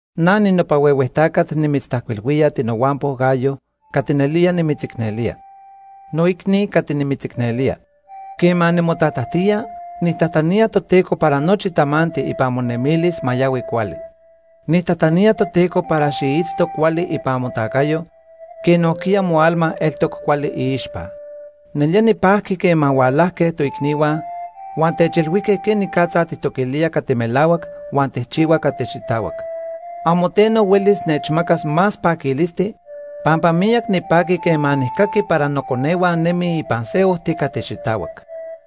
Na ninopa huehue tacat nimitztajcuilhuía, tinohuampo Gayo, cati nelía nimitzicnelía. Noicni cati nimitzicnelía, quema nimotatajtía, nijtajtanía Toteco para nochi tamanti ipan monemilis ma yahui cuali. Nijtajtanía Toteco para xiitzto cuali ipan motacayo quej nojquiya moalma eltoc cuali iixpa. Nelía nipajqui quema hualajque toicnihua huan techilhuijque quenicatza tijtoquilía cati melahuac huan tijchihua cati xitahuac. Amo teno huelis nechmacas más paquilisti, pampa miyac nipaqui quema nijcaqui para noconehua nemij ipan se ojti cati xitahuac.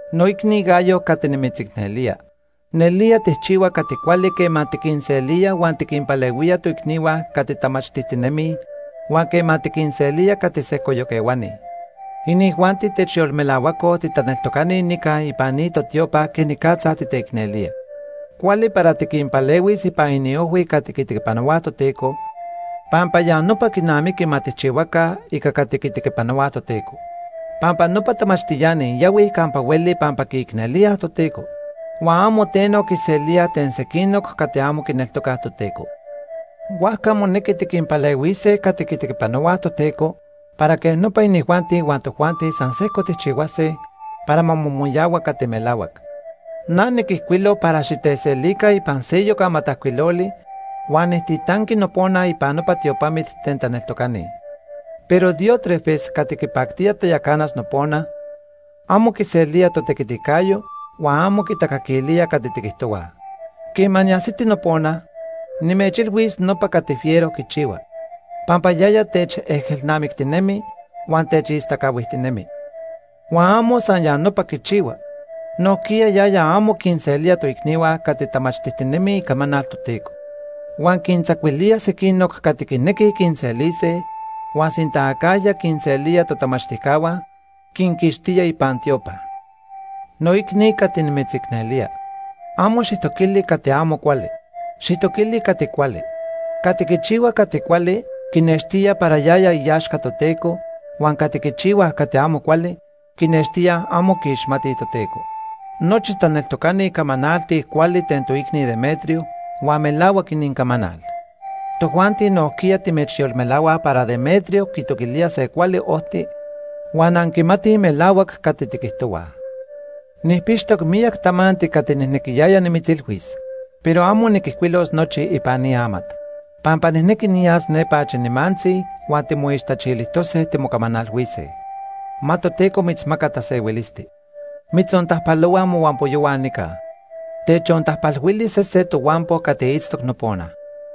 Noicni Gayo cati nimitzicnelía, nelía tijchihua cati cuali quema tiquinselía huan tiquinpalehuía toicnihua cati tamachtijtinemij, huan quema tiquinselía cati sejcoyoc ehuani. Inijuanti techyolmelahuacoj titaneltocani nica ipan ni totiopa quenicatza titeicnelía. Cuali para tiquinpalehuis ipan iniojhui cati quitequipanohuaj Toteco, pampa ya nopa quinamiqui ma tijchihuaca ica cati quitequipanohuaj Toteco. Pampa nopa tamachtiani yahuij campa hueli pampa quiicnelíaj Toteco. Huan amo teno quiselíaj ten sequinoc cati amo quineltocaj Toteco. Huajca monequi tiquinpalehuise cati quitequipanohuaj Toteco para quej nopa inijuanti huan tojuanti san sejco tijchihuase para ma momoyahua cati melahuac. Na niquijcuilo para xiteselica ipan seyoc amatajcuiloli huan nijtitanqui nopona ipan nopa tiopamit ten taneltocani. Pero Diótrefes cati quipactía tayacanas nopona, amo quiselía totequiticayo huan amo quitacaquilía cati tiquijtohuaj. Quema niajsiti nopona, nimechilhuis nopa cati fiero quichihua, pampa yaya techejelnamictinemi huan techistacahuijtinemi. Huan amo san ya nopa quichihua, nojquiya yaya amo quinselía toicnihua cati tamachtijtinemij icamanal Toteco. Huan quintzacuilía sequinoc cati quinequij quinselise, huan sinta acajya quinselía totamachtijcahua, quinquixtía ipan tiopa. Noicni cati nimitzicnelía, amo xijtoquili se cati amo cuali. Xijtoquili cati cuali. Cati quichihua cati cuali quinextía para yaya iaxca Toteco, huan cati quichihuaj cati amo cuali quinextíaj amo quiixmatij Toteco. Nochi taneltocani camanaltij cuali ten toicni Demetrio huan melahuac inincamanal. Tojuanti nojquiya timechyolmelahuaj para Demetrio quitoquilía se cuali ojti huan anquimatij melahuac cati tiquijtohuaj. Nijpixtoc miyac tamanti cati nijnequiyaya nimitzilhuis, pero amo niquijcuilos nochi ipan ni amat. Pampa nijnequi niyas nepa achi nimantzi huan timoixtachilijtose timocamanalhuise. Ma Toteco mitzmaca tasehuilisti. Mitzontajpalohuaj mohuampoyohua nica. Techontajpalhuili sese tohuampo cati itztoc nopona.